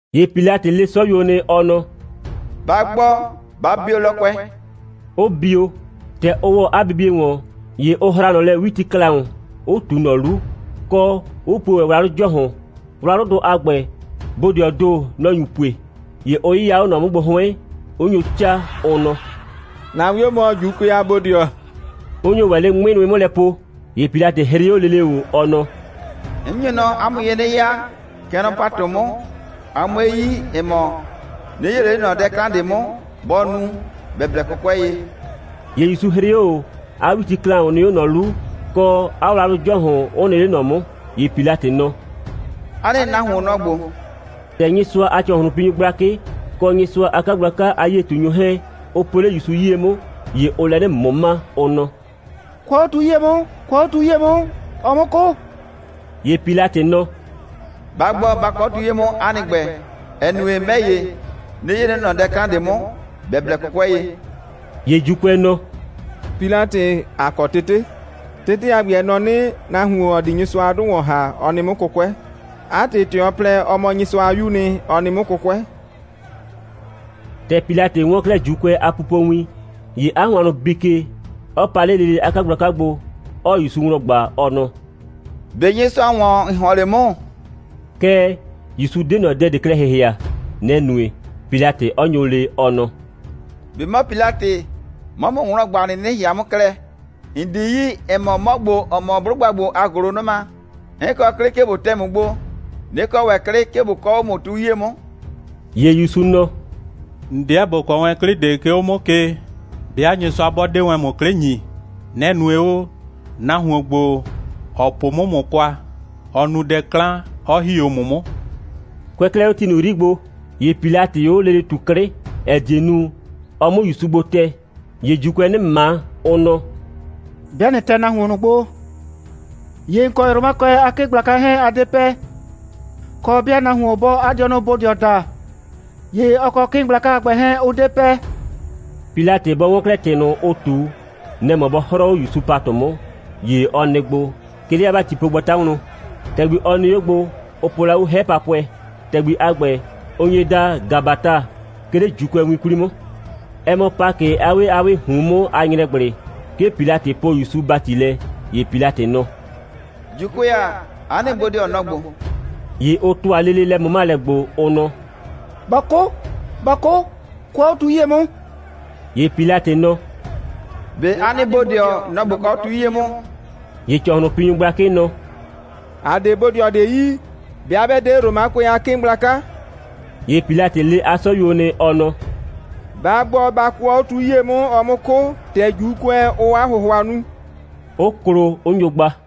‑Ye Pilatɩ le 'sɔyuo nɩ, ɔ nɔ: «Ba gbɔ, ba bio lɔkʋɛ!» 'ʋ bio. ‑Tɛ ʋ ‑wɔ 'a bibie ‑wɔn, ‑ye ʋ hra ꞊nɔ lɛ 'witiklaʋn, 'ʋ ꞊tu ꞊nɔ 'lu, kɔ, 'ʋ puo ‑wɛ wlawlʋ ‑jɔhʋn. Wlawlʋdʋ a ‑gbɛ, bodɩɔpʋʋ ‑do, nʋ‑ nyu pue. ‑Ye ʋ 'yɩya 'o ꞊nɔ 'mʋ gbo 'hʋɩn, 'ʋ nyo 'caa, ʋ nɔ: «‑Na 'wio mɔ, ‑Juukʋɛ a bodɩɔ,» 'ʋ nyo ‑wɛ 'le 'ŋmɩ nʋɩ 'mʋ lɛ po. ‑Ye Pilatɩ 'hrɩ 'o lele ꞊o, ɔ nɔ: «'N nyo nɔ 'a mʋ ye 'nɩ ya, kɛ nɔ ‑patʋ 'mʋ, a 'mue yi, ‑ɛ mɔ, 'nɩ 'yee ꞊le 'le ꞊nɔ dɛ 'klan ꞊de 'mʋ, bɔ nu, ‑bɛ blɛ 'kʋkʋɛ ye.» ‑Ye ‑Yusu 'hrɩ 'o ꞊o, 'a 'witiklaʋn nɩ 'o ꞊nɔ 'lu, kɔ, 'a wlawlʋ ‑jɔhʋn 'ʋ nɩ 'le ꞊nɔ 'mʋ. ‑Ye Pilatɩ nɔ: «'A nɩ nahuon, nɔ‑ ‑gbo.» ‑Tɛ Nyɩsʋa a ‑cɔhlʋnpinyʋ gblakɩ kɔ Nyɩsʋa a 'kagblaka a 'yie꞊tunyʋ 'hɛɛn, ʋ po 'le ‑Yusu 'yie 'mʋ, ‑ye ʋʋ lɛ 'nɩ ꞊mʋma, ʋ nɔ: «Kʋɔ 'o tu 'yie 'mʋ, kʋɔ 'o tu 'yie 'mʋ, ɔ 'mʋ 'kʋ!» ‑Ye Pilatɩ nɔ: «Ba gbɔ, ba kʋɔ 'o tu 'yie 'mʋ 'a nɩ ‑gbɛ, ‑ɛ nue, 'mɛ ‑ye, 'nɩ 'yee ꞊le 'le ꞊nɔ dɛ 'klan ꞊de 'mʋ, ‑bɛ blɛ 'kʋkʋɛ ye.» ‑Ye ‑Juukʋɛ nɔ: «Pilatɩ, ‑a kɔ tete. Tete a ‑gbɛ, ɛ nɔ 'nɩ, nahuon, ‑ɔ di Nyɩsʋa a 'dʋ ‑wɔn ‑ha, ɔ nɩ 'mʋ 'kʋkʋɛ. 'A ‑tɩ, ‑tɛ ɔ plɛ, ɔ mɔ Nyɩsʋa a 'Yuu nɩ, ɔ nɩ 'mʋ 'kʋkʋɛ.» ‑Tɛ Pilatɩ 'wɔn 'klɛɛ ‑Juukʋɛ a pupowin, ‑ye 'a hʋannʋ bii ke, 'ɔ pa 'le lele 'a 'kagblaka gbo, 'ɔɔ ‑Yusu wlɔn ꞊gba, ɔ nɔ: «꞊Be Nyɩsʋa ‑wɔn, ‑n ‑hɔn 'le 'mʋ?» Kɛɛ, ‑Yusu 'de ꞊nɔ dɛ ꞊de klɛ ‑hɩhɩa. Nɛ‑ nue, Pilatɩ 'ɔ nyo le, ɔ nɔ: «꞊Be 'mɔ Pilatɩ, 'mɔɔ ‑mʋ wlɔn ꞊gba, ꞊nɩnɩ ‑hɩhɩa 'mʋ klɛ? ‑N 'di yi, ‑ɛ mɔ, 'mɔ ‑gbo, ‑ɔ mɔ 'blʋgba ‑gbo a ‑gʋlʋnʋma, 'n kɔ 'klɩ, 'ke ꞊bo tɛ ‑mʋ gbo, 'nɩ kɔ ‑wɛ 'klɩ, 'ke ꞊bo kɔɔ 'o ‑mʋ tu 'yie 'mʋ.» ‑Ye ‑Yusu nɔ: «‑N 'deɛ ‑bo kɔ wɛn 'klɩ ꞊de, 'ke 'o 'mʋ ke, 'bɩa Nyɩsʋa 'bɔ 'de wɛn ‑mʋ 'klɩ ‑nyi. Nɛ‑ nue o, nahuon ‑gbo, ‑ɔ po 'mʋ ‑mʋ kwa, ɔ nu dɛ 'klan, 'ɔ ‑hi 'o ‑mʋ 'mʋ.» Kʋɛ 'klɛɛ 'o ti ꞊nʋ 'yri gbo, ‑ye Pilatɩɩ 'o lele ꞊tu 'klɩ, ‑ɛ die nu, ɔ 'mʋ ‑Yusu gbo tɛ. ‑Ye ‑Juukʋɛɛ 'nɩ ꞊ma, ʋ nɔ: «'Bɩa ꞊nɩ tɛ nahuon ꞊nʋ gbo, ‑ye ‑n kɔ Romakʋɛ a 'kɩɩn gblaka 'hɛɛn, a 'de pɛ. Kɔ, 'bɩa nahuon 'bɔɔ 'a dɩɔnʋ bodɩɔ daa, ‑ye ɔ kɔ 'kɩɩn gblaka a ‑gbɛ 'hɛɛn, ʋ 'de pɛ.» Pilatɩ bɔ 'wɔn 'klɛɛ ‑tɩ ꞊nʋ, ʋ ꞊tu, nɛ‑ mɔ bɔ 'hrɔɔ 'o ‑Yusu ‑patʋ 'mʋ, ‑ye ɔ nɩ gbo, 'ke 'le 'a ‑batipogbata wlɔn. ‑Tɛgbi, ɔ nɩ 'o gbo, ʋ po la 'o gblɛ 'hɛ papʋɩ. ‑Tɛgbi a ‑gbɛ, ʋ nye daa Gabata, 'ke 'le ‑Juukʋɛwin 'kwli 'mʋ. Ɛ mɔ Pakɩ a 'wee a 'wɩɩ ꞊hun 'mʋ a ‑nyrɛgblɩ, 'ke Pilatɩ poo ‑Yusu ‑bati lɛ. ‑Ye Pilatɩ nɔ: «‑Juukʋɛ ‑a, 'a nɩ bodɩɔ, nɔ‑ ‑gbo.» ‑Ye ʋ ‑tʋa lele lɛ꞊mʋmalɛ gbo, ʋ nɔ: «Bɔ 'kʋ, bɔ 'kʋ, kʋɔ 'o tu 'yie 'mʋ!» ‑Ye Pilatɩ nɔ: «꞊Be 'a nɩ bodɩɔ, nɔ‑ ꞊bo kɔɔ 'o tu 'yie 'mʋ?» ‑Ye ‑cɔhlʋnpinyʋ gblakɩ nɔ: «‑A 'de bodɩɔ ꞊de yi, 'bɩa 'bɛ 'de Romakʋɛ a 'kɩɩn gblaka.» ‑Ye Pilatɩ le 'a 'sɔyuo nɩ, ɔ nɔ: «Ba gbɔ, ba kʋɔ 'o tu 'yie 'mʋ, ɔ 'mʋ 'kʋ, ‑tɛ ‑Juukʋɛ, ʋʋ 'a ‑hʋhʋa nu!» 'ʋ klo, 'ʋ nyo gba.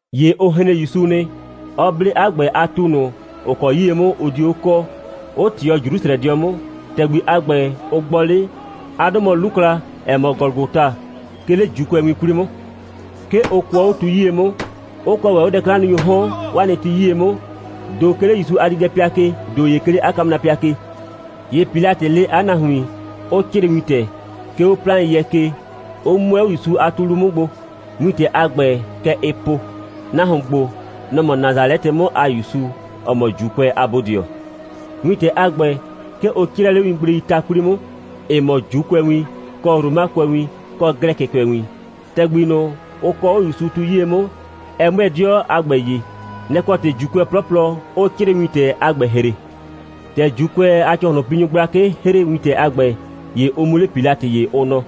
‑Ye ʋ hren ‑Yusu nɩ, 'ɔ 'ble 'a ‑gbɛ a tu ꞊nʋ, ‑ʋ kɔ 'yie 'mʋ ʋ dio 'o kɔɔ, 'ʋ ꞊tɩɔ Jrusrɛdɩɔ 'mʋ. ‑Tɛgbi a ‑gbɛ, ʋ gbɔ 'le, 'a 'dʋ mɔ 'Lukla, ‑ɛ mɔ Gɔlʋgɔta, 'ke 'le ‑Juukʋɛwin 'kwli 'mʋ. 'Ke ʋ kʋɔ 'o tu 'yie 'mʋ. Ʋ kɔɔ ‑wɛ 'o dɛ'klannunyʋʋ 'hɔn 'waa nɩ ti 'yie 'mʋ, ‑do 'ke 'le ‑Yusu a diidɛpɩa ke, ‑do ‑ye 'ke 'le 'a kamrapɩa ke. ‑Ye Pilatɩ le 'a nahuin, 'ʋ 'crɩɩ wintɛ, 'ke 'o 'plaɩn.yɛ ke, 'ʋ 'mʋɛ 'o ‑Yusu a tu 'lu 'mʋ gbo. Wintɛ a ‑gbɛ, kɛ ɛɛ po: «Nahuon ‑gbo, nɔ‑ mɔ Nasalɛtɩ 'mʋ a ‑Yusu, ‑ɔ mɔ ‑Juukʋɛ a bodɩɔ.» Wintɛ a ‑gbɛ, 'ke ʋ 'crɛɛ 'le wingbleii ta 'kwli 'mʋ, ‑ɩ mɔ ‑Juukʋɛwin, kɔ Romakʋɛwin, kɔ Glɛkɩkʋɛwin. ‑Tɛgbi ꞊nʋ, ʋ kɔɔ 'o ‑Yusu tu 'yie 'mʋ, ɛ 'mʋɛɛ 'dɩɔ a ‑gbɛ ye. Nɛ‑ kɔ ‑tɩ, ‑Juukʋɛ 'plɔplɔ 'ʋʋ 'crɩɩwintɛ a ‑gbɛ ‑hre. ‑Tɛ ‑Juukʋɛ a ‑cɔhlʋnpinyʋ gblakɩ ‑hre wintɛ a ‑gbɛ, ‑ye ʋ mu 'le Pilatɩ ye, ʋ nɔ: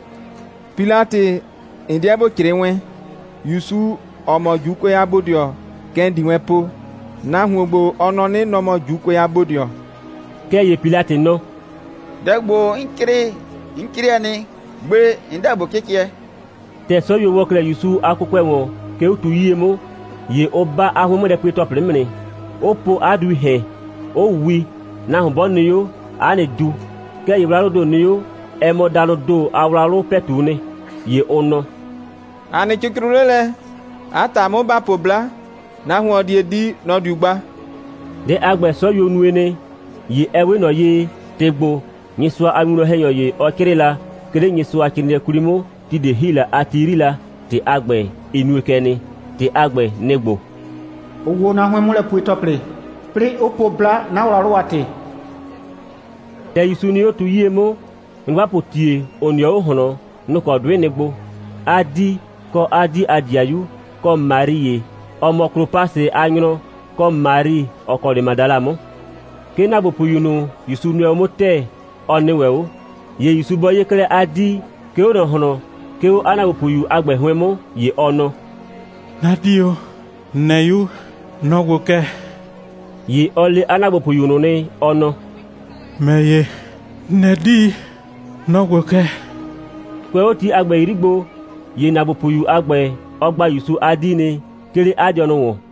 «Pilatɩ, ‑n 'deɛ ‑bo 'crɩɩ wɛn: ‑Yusu, ‑ɔ mɔ ‑Juukʋɛ a bodɩɔ, kɛ ‑n di wɛn po: Nahuon ‑gbo, ɔ nɔ 'nɩ, nɔ‑ mɔ ‑Juukʋɛ a bodɩɔ.» Kɛɛ, ‑ye Pilatɩ nɔ: «Dɛ ‑gbo, 'n 'crɩɩ, 'n 'crɛɛ nɩ. Gbe 'n 'deɛ ꞊bo 'cɩcɩɛ.» ‑Tɛ 'sɔyuo ‑wɔ 'klɛɛ ‑Yusu a kʋkʋɛ ‑wɔn, 'ke 'o tu 'yie 'mʋ, ‑ye ʋ 'ba 'a 'hʋɩn'mʋlɛpue‑tɔplɩ 'mʋ nɩ, 'ʋ po 'a duii ‑hɛn, 'ʋ wi, nahuon 'bɔ nɩ 'o, 'a nɩ du. Kɛɛ, ‑ye wlawlʋʋ ‑do nɩ 'o, ɛ mɔ danʋʋ ‑do a wlawlʋ ‑pɛtu'u nɩ. ‑Ye ʋ nɔ: «‑A nɩ cɩcrʋ 'le lɛ. 'A ‑ta 'mʋ, ‑ba po 'bla, nahuon, ‑ɔ die di, nɔ‑ diu gba.» Dɛ a ‑gbɛ, 'sɔyuo nue nɩ. ‑Ye ɛ 'we ꞊nɔ ye, ‑tɩ ‑gbo, Nyɩsʋa a winwlɔn‑hɛnyɔ ‑ye, ɔ 'crɩɩ la, 'ke 'le Nyɩsʋacrɩɩnɩɛ 'kwli 'mʋ, ti ꞊de ‑hi la a ti 'yri la, ‑tɩ a ‑gbɛ, ɩ nue kɛ nɩ. ‑Tɩ a ‑gbɛ, nɩ‑ ‑gbo: «Ʋ wo 'na 'hʋɩn'mʋlɛpue‑tɔplɩ, 'plɩɩ 'ʋ po 'bla, 'na wlawlʋ a ‑tɩ.» ‑Tɛ ‑Yusu nɩ 'o tu 'yie 'mʋ, nyrʋgbapʋʋ ‑tie, ‑ʋ nɩɔ 'o ꞊hlɔn, nʋ‑ kɔ 'dʋɩ nɩ gbo: 'a 'dii, kɔ 'a 'dii a ‑dɩayu, kɔ Mari ‑ye, ‑ɔ mɔ Klopasɩ a nyrɔ, kɔ Mari, ‑ɔ kɔ 'le Madala 'mʋ. 'Ke ‑naagbopʋyu ꞊nʋ, ‑Yusu nʋɛ 'mʋ ‑tɛɛ, ɔ nɩ ‑wɛ 'o. ‑Ye ‑Yusu bɔ 'ye 'klɛɛ 'a 'dii, 'ke 'o ꞊nɔ ꞊hlɔn, 'ke 'o 'a ‑naagbopʋyu a ‑gbɛ 'hʋɩn 'mʋ, ‑ye ɔ nɔ: «'Na 'dii o, ‑n nɛ 'yu, nɔ‑ ‑gbo kɛ.» ‑Ye ɔ le 'a ‑naagbopʋyu ꞊nʋ nɩ, ɔ nɔ: «‑Mɛ ‑ye, ‑n nɛ 'dii, nɔ‑ ‑gbo kɛ.» Kʋɛ 'o ti a ‑gbɛ 'yri gbo, ‑ye ‑naagbopʋyu a ‑gbɛ, ɔ gba ‑Yusu a 'dii nɩ, 'ke 'le 'a dɩɔnʋ ‑wɔn.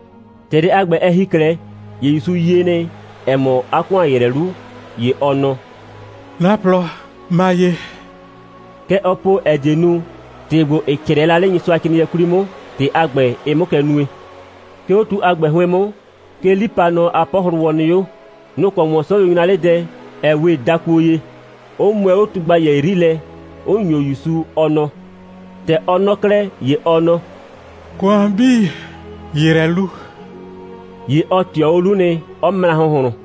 ‑Tɛ dɛ a ‑gbɛ, ɛ ‑hi 'klɛɛ, ‑ye ‑Yusu yie nɩ, ‑ɛ mɔ, 'a ‑kʋan ‑yrɛ 'lu, ‑ye ɔ nɔ: «'Na plɔ ma ye.» Kɛ ɔ po, ‑ɛ die nu, ‑tɩ ‑gbo, ‑ɩ 'crɛɛ la 'le Nyɩsʋacrɩɩnɩɛ 'kwli 'mʋ, ‑tɩ a ‑gbɛ, ɩ 'mʋ kɛ nue. 'Ke 'o tu a ‑gbɛ 'hʋɩn 'mʋ, 'ke 'lipanɔ a 'pɔhlʋwɔ nɩ 'o. Nʋ‑ kɔ ‑wɔn 'sɔyuo 'nyra 'le dɛ, ‑ɛ 'we dakuo ye, 'ʋ mʋɛ 'o tugbayɛ 'yri lɛ, 'ʋ ‑nyo ‑Yusu, 'ɔ 'nɔ. ‑Tɛ ɔ 'nɔ 'klɛɛ, ‑ye ɔ nɔ: «‑Kʋan 'bii ‑yrɛ 'lu.» ‑Ye ɔ ꞊tɩɔ 'o 'lu nɩ, 'ɔ mra ‑hʋnhlʋn.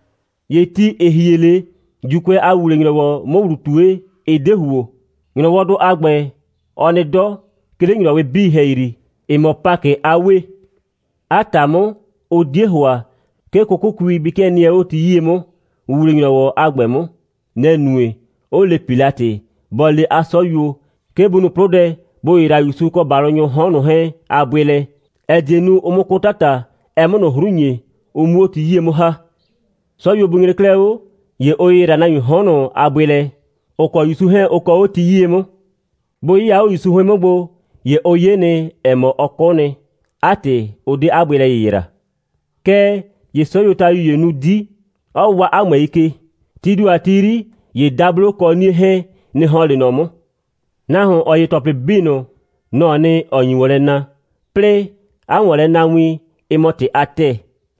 ‑Ye ti, ‑ɩ hie 'le, ‑Juukʋɛ a ‑wuwle‑nyrɔwɔ 'mʋ ‑wlu ꞊tue, ɩ 'de ‑huo. ‑Nyrɔwɔdʋ a ‑gbɛ, ɔ nɩ 'dɔ, 'ke 'le ‑nyrɔwɩ 'bii ‑hɛyri, ‑ɩ mɔ Pakɩ a 'wee. 'A ‑ta 'mʋ, ʋ 'die ‑hʋa, 'ke 'kʋkʋkui bɩ 'kɩɛ nɩɛ 'o ti 'yie 'mʋ ‑wuwle‑nyrɔwɔ a ‑gbɛ 'mʋ. Nɛ‑ nue, 'ʋ le Pilatɩ, bɔ le 'a 'sɔyuo, 'ke bʋ nu 'plʋdɛ, bʋ ‑yɩyra ‑Yusu kɔ ‑balʋnyʋʋ 'hɔn ꞊nʋ 'hɛɛn a bʋɩ lɛ, ‑ɛ die nu, ʋ 'mʋ 'kʋ 'tata, ɛ 'mʋ ꞊nʋ 'hru ‑nye, ʋ 'mu 'o ti 'yie 'mʋ ‑ha. 'Sɔyuo bʋ nyre 'klɛɛ 'o, ‑ye ʋ ‑yɩyra nahuiin 'hɔn ꞊nʋ a bʋɩ lɛ, ‑ʋ kɔ ‑Yusu 'hɛɛn ʋ kɔɔ 'o ti 'yie 'mʋ. Bʋ 'yɩya 'o ‑Yusu 'hʋɩn 'mʋ gbo, ‑ye ʋ 'ye nɩ, ‑ɛ mɔ, ɔ 'kʋ nɩ. 'A ‑tɩ, ʋ 'de 'a bʋɩ lɛ ‑yɩyra. Kɛɛ ‑ye 'sɔyuotayu ‑ye nu 'di, 'ɔ waa 'a ꞊mʋɛi ke. Tii ‑do a ti 'yri, ‑ye dablo kɔ 'nie 'hɛɛn, nɩ‑ ‑hɔn 'le ꞊nɔ 'mʋ. Nahuon, ‑ɔ 'ye ‑tɔplɩ 'bii ꞊nʋ, nɔ‑ɔ nɩ, ‑ɔ nyi ‑wɔn lɛ na, 'plɩɩ 'a ‑wɔnlɛnawin, ɩ mɔ ‑tɩ a ‑tɛɛ.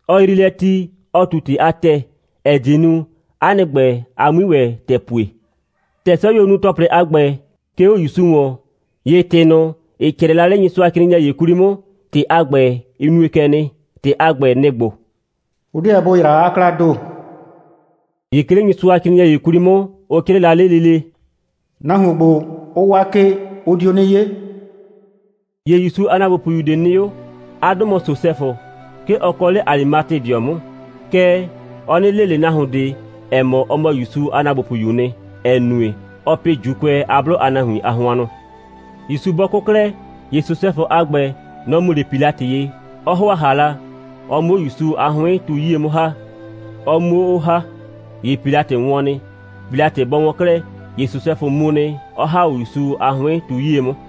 Ɔ yrii lɛ ti, ɔ ꞊tu ‑tɩ a ‑tɛɛ, ‑ɛ die nu, 'a nɩ ‑gbɛ, a 'mui ‑wɛ ‑tɛɛ pue. ‑Tɛ 'sɔyuo nu ‑tɔplɩ a ‑gbɛ, 'ke 'o ‑Yusu ‑wɔn, ‑ye ‑tɩ ꞊nʋ, ‑ɩ 'crɛɛ la 'le Nyɩsʋacrɩɩnɩɛ ‑ye 'kwli 'mʋ, ‑tɩ a ‑gbɛ, ɩ nue kɛ nɩ. ‑Tɩ a ‑gbɛ, nɩ‑ ‑gbo: «Ʋ 'deɛ bʋ ‑yra 'a 'klaa ‑do.» ‑Ye 'ke 'le Nyɩsʋacrɩɩnɩɛ ‑ye 'kwli 'mʋ, ʋ 'crɩɩ la 'le lele: «Nahuon ‑gbo, ʋ waa ke, ʋ dio 'nɩ 'ye.» ‑Ye ‑Yusu a ‑naagbopʋyu ꞊de nɩ 'o. 'A 'dʋ mɔ Sosɛfʋ. 'Ke ɔ kɔ 'le Alimatedɩɔ 'mʋ. Kɛɛ, ɔ 'nɩ le ꞊le nahuon ꞊de, ‑ɛ mɔ, ɔ mɔ ‑Yusu a ‑naagbopʋyuu nɩ, ‑ɛ nue, ɔɔ pɩ ‑Juukʋɛ a 'blʋ a nahuin a hʋannʋ. ‑Yusu bɔ 'kʋ 'klɛɛ, ‑ye Sosɛfʋ a ‑gbɛ, nɔ‑ mu 'le Pilatɩ ye, 'ɔ ‑hʋa ‑hala, ɔ 'mʋ 'o ‑Yusu a 'hʋɩn tu 'yie 'mʋ ‑ha, ɔ 'muo 'o ‑ha. ‑Ye Pilatɩ wɔn nɩ. Pilatɩ bɔ wɔn 'klɛɛ, ‑ye Sosɛfʋ mu nɩ, 'ɔ ‑ha 'o ‑Yusu a 'hʋɩn tu 'yie 'mʋ.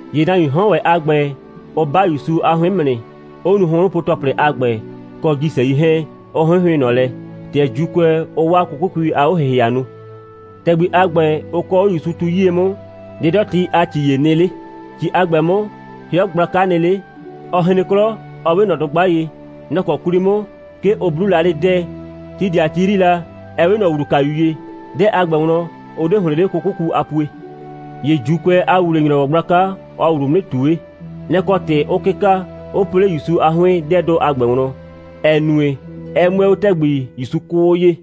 ‑Ye nahuiin 'hɔn ‑wɛ a ‑gbɛ, ʋ 'ba ‑Yusu a 'hʋɩn 'mʋ nɩ, 'ʋ nu hʋnhrʋnpo‑tɔplɩ a ‑gbɛ kɔ ‑jisɛi 'hɛɛn, 'ʋ 'hɩnhɩʋɩn ꞊nɔ lɛ, ‑tɛ ‑Juukʋɛ, ʋʋ 'o 'waa 'kʋkʋkui a 'o‑hɩhɩa nu. ‑Tɛgbi a ‑gbɛ, ʋ kɔɔ 'o ‑Yusu tu 'yie 'mʋ, 'dɩdɔti a ‑ci ‑ye nɩ 'le. ‑Ci a ‑gbɛ 'mʋ, 'hɩɔ gblaka nɩ 'le, 'ɔ hren 'klɔ, 'ɔ 'we ꞊nɔ dʋgba ye. Nɔ‑ kɔ 'kwli 'mʋ, 'ke ʋ 'bluu la 'le 'dɛɛ, (ti ꞊de a ti 'yri la, ‑ɛ 'we ꞊nɔ ‑wlukayu ye). 'Dɛɛ a ‑gbɛ wlɔn, ʋ 'de ‑hlɩn 'le 'kʋkʋku a pue. ‑Ye ‑Juukʋɛ a ‑wuwle‑nyrɔwɔ gblaka, ɔɔ ‑wlu mu 'nɩ ꞊tue. Nɔ‑ kɔ ‑tɩ 'ʋʋ 'kɩka, 'ʋ po 'le ‑Yusu a 'hʋɩn 'dɛɛdʋ a ‑gbɛ wlɔn, ‑ɛ nue, ɛ 'mʋɛɛ 'o ‑tɛgbi, ‑Yusu 'kʋʋ 'o ye.